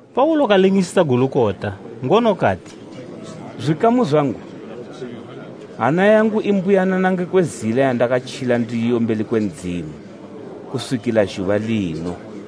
Paulo kalingisisa Gulukota, ngono kati, “Zwikamu zwangu, hana yangu i mbuyanana ngekwe zila yandakatjila ndiyo mbeli kwe Ndzimu kuswikila zhuba lino.”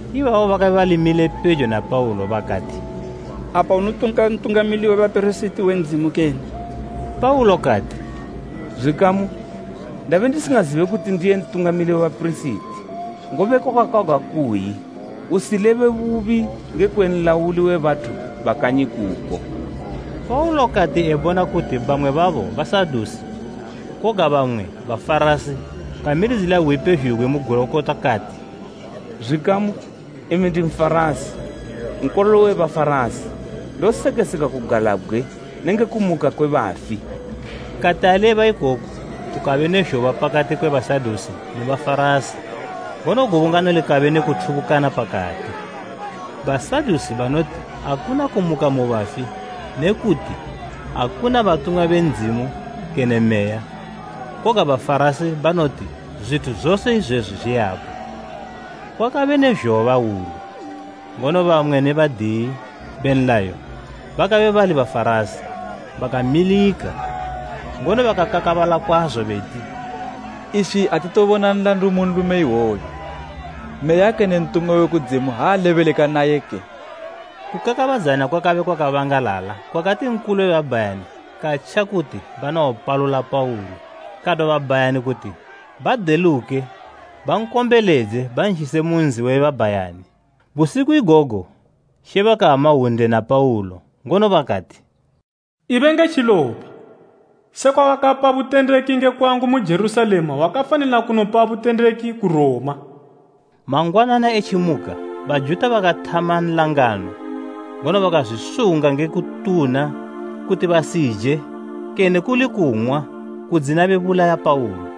Ibabo bakabe bali mile pejo na Paulo bakati, “Apa unotuka Ntungamili we bapirisiti we Ndzimu kene?” Paulo kati, “Zwikamu, ndabe ndisingazibe kuti ndiye Ntungamili we bapirisiti; ngobe kwakakwagwa kuyi, ‘Usilebe bubi ngekwe nlauli we bathu ba kanyi kuko.’” Paulo kati ebona kuti bamwe babo Basadusi koga bamwe Bafarasi kamilidzila hwi pezhugwi mu Gulukota kati, “Zwikamu, imi ndi Nfarasi, nkololo we Bafarasi. Ndosekesegwa kugalabgwe nenge kumuka kwe bafi!” Kati aleba ikoku kukabe ne zhoba pakati kwe Basadusi ne Bafarasi, ngono gubungano likabe ne kuthubukana pakati. Basadusi banoti akuna kumuka mu bafi ne kuti akuna batumwa be Ndzimu kene Meya, koga Bafarasi banoti zwithu zose izwezwi zwiyapo. Kwakabe ne zhoba hwulu, ngono bamwe be badiyi be nlayo bakabe bali Bafarasi bakamilika, ngono bakakakabala kwazo beti, “Iswi atitobona nlandu mu nlume iwoyu. Meya kene ntumwa we kudzimu ha alebeleka nayeke?” Kukakabadzana kwakabe kwakabangalala kwakati Nkulu we babhayani katja kuti banowopalula Paulo. Kadwa babhayani kuti badeluke bankombeledze banzhise mu nzi we babhayani. Busiku igogo She bakama hwunde na Paulo, ngono bakati, “Ibe nge tjilopa! Sekwa wakapa butendeki nge kwangu mu Jerusalema wakafanila kunopabo butendeki ku Roma.” Mangwanana etjimuka Bajuta bakathama nlangano ngono bakazwisunga nge kutuna kuti basije kene kuli kung'wa kudzina bebulaya Paulo.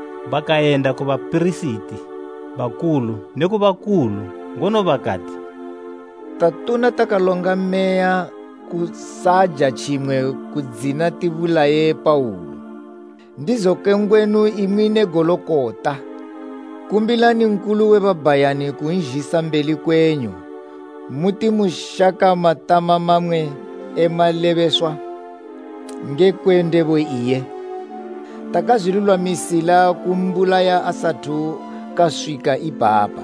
Bakayenda ku bapirisiti bakulu neku bakulu, ngono bakati, “Tatuna takalonga meya kusaja tjimwe kudzina tibulaye Paulo. Ndizoke ngwenu, imwi ne Gulukota, kumbilani Nkulu we babhayani kunzhisa mbeli kwenyu muti moshaka matama mamwe e malebeswa ngekwe ndebo iye. Takazwilulwamisila kumbulaya asathu kaswika ipapa.”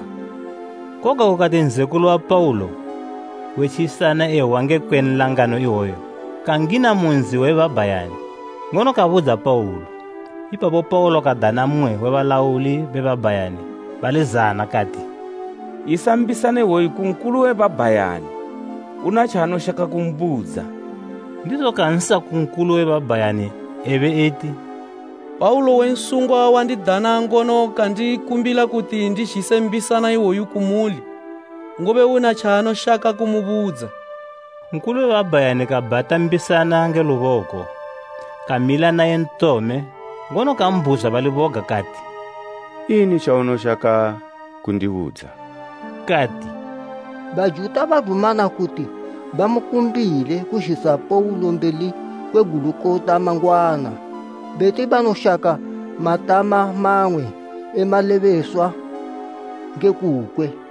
Koga kukati nzekulu wa Paulo we tjilisana ehwa ngekwe nlangano iwoyo kangina mu nzi we babhayani, ngono kabudza Paulo. Ipapo Paulo kadana mmwe we balauli be babhayani bali zana kati, “Yisa mbisana iwoyu ku Nkulu we babhayani; una tjaanoshaka kumbudza.” Ndizo kansa ku Nkulu we babhayani ebe eti, “Paulo we nsungwa wandidana, ngono kandikumbila kuti ndizhise mbisana iwoyu kumuli, ngobe una tjaanoshaka kumubudza.” Nkulu we babhayani kabhata mbisana nge luboko, kamila naye ntome ngono kambhuzwa bali boga kati, “Ini tjaunoshaka kundibudza?” Kati, “Bajuta badumana kuti bamukumbile kuzhisa Paulo mbeli kwe Gulukota mangwana beti banoshaka matama mamwe e malebeswa nge kukwe.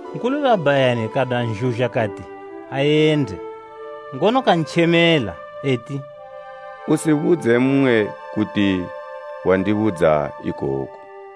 Nkulu we babhayani kadwa nzhuzha kati ayende, ngono kantjemela eti, “Usibudze mmwe kuti wandibudza ikoku.”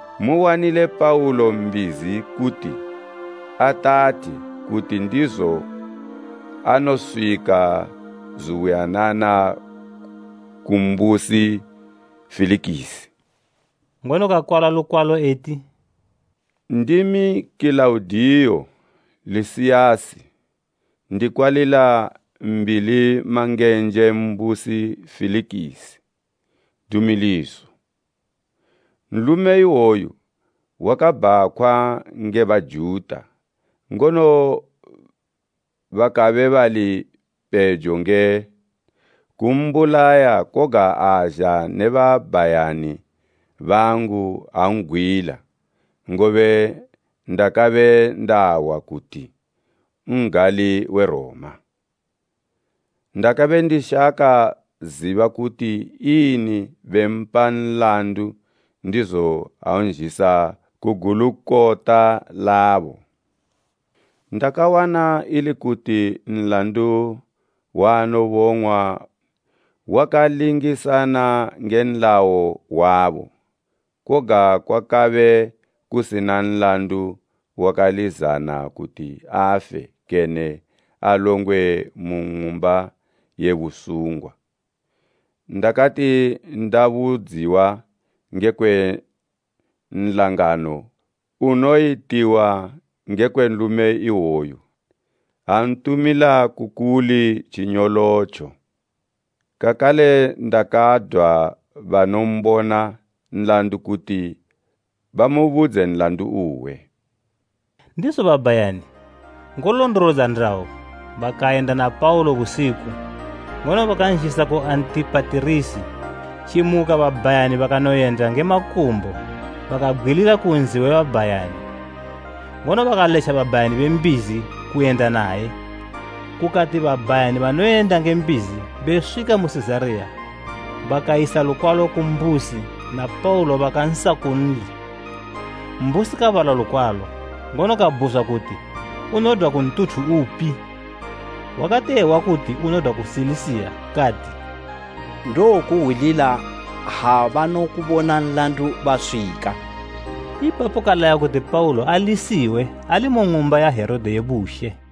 Muwanile Paulo mbizi kuti atathe, kuti ndizo anoswika zubuyanana ku mbusi Felikisi.” Ngono kakwala lukwalo eti, “Ndimi Kilaudiyo Lisiyasi, kuna Mbilimangenje, Mbusi Felikisi, Dumiliso. Nlume iwoyu wakabhakhwa nge Bajuta, ngono bakabe bali pejo nge kumbulaya koga azha ne babhayani bangu an'gwila, ngobe ndakabe ndahwa kuti n'gali we Roma. Ndakabe ndishako ziba kuti ini bempa nlandu ndizo anzhisa ku Gulukota labo. Ndakawana ili kuti nlandu waanobong'wa wakalingisana nge nlayo wabo, koga kwakabe kusina nlandu wakalizana kuti afe kene alongwe mu ng'umba ye busungwa. Ndakati ndabudziwa ngekwe nlangano unoyitiwa ngekwe nlume iwoyu, antumila ku muli tjinyolotjo. Kakale ndakadwa banombona nlandu kuti bamubudze nlandu uwe.” Ndizo babhayani, ngolondolodza ndayo, bakayenda na Paulo busiku, ngono bakanzhisa ku Antipatirisi. Tjimuka babhayani banoyenda nge makumbo bakabgwilila ku nzi we babhayani, ngono bakaletja babhayani be mbizi kuyenda naye. Kukati babhayani banoyenda nge mbizi beswika mu Sizariya bakayisa lukwalo ku mbusi, na Paulo bakansa kunli. Mbusi kabala lukwalo, ngono kabhuzwa kuti unodwa ku ntuthu upi. Wakati ehwa kuti unodwa ku Silisiya kati, “Ndowokuhwilila ha banokubona nlandu baswika.” Ipapo kalaya kuti Paulo alisiwe ali mu ng'umba ya Herode ye bushe.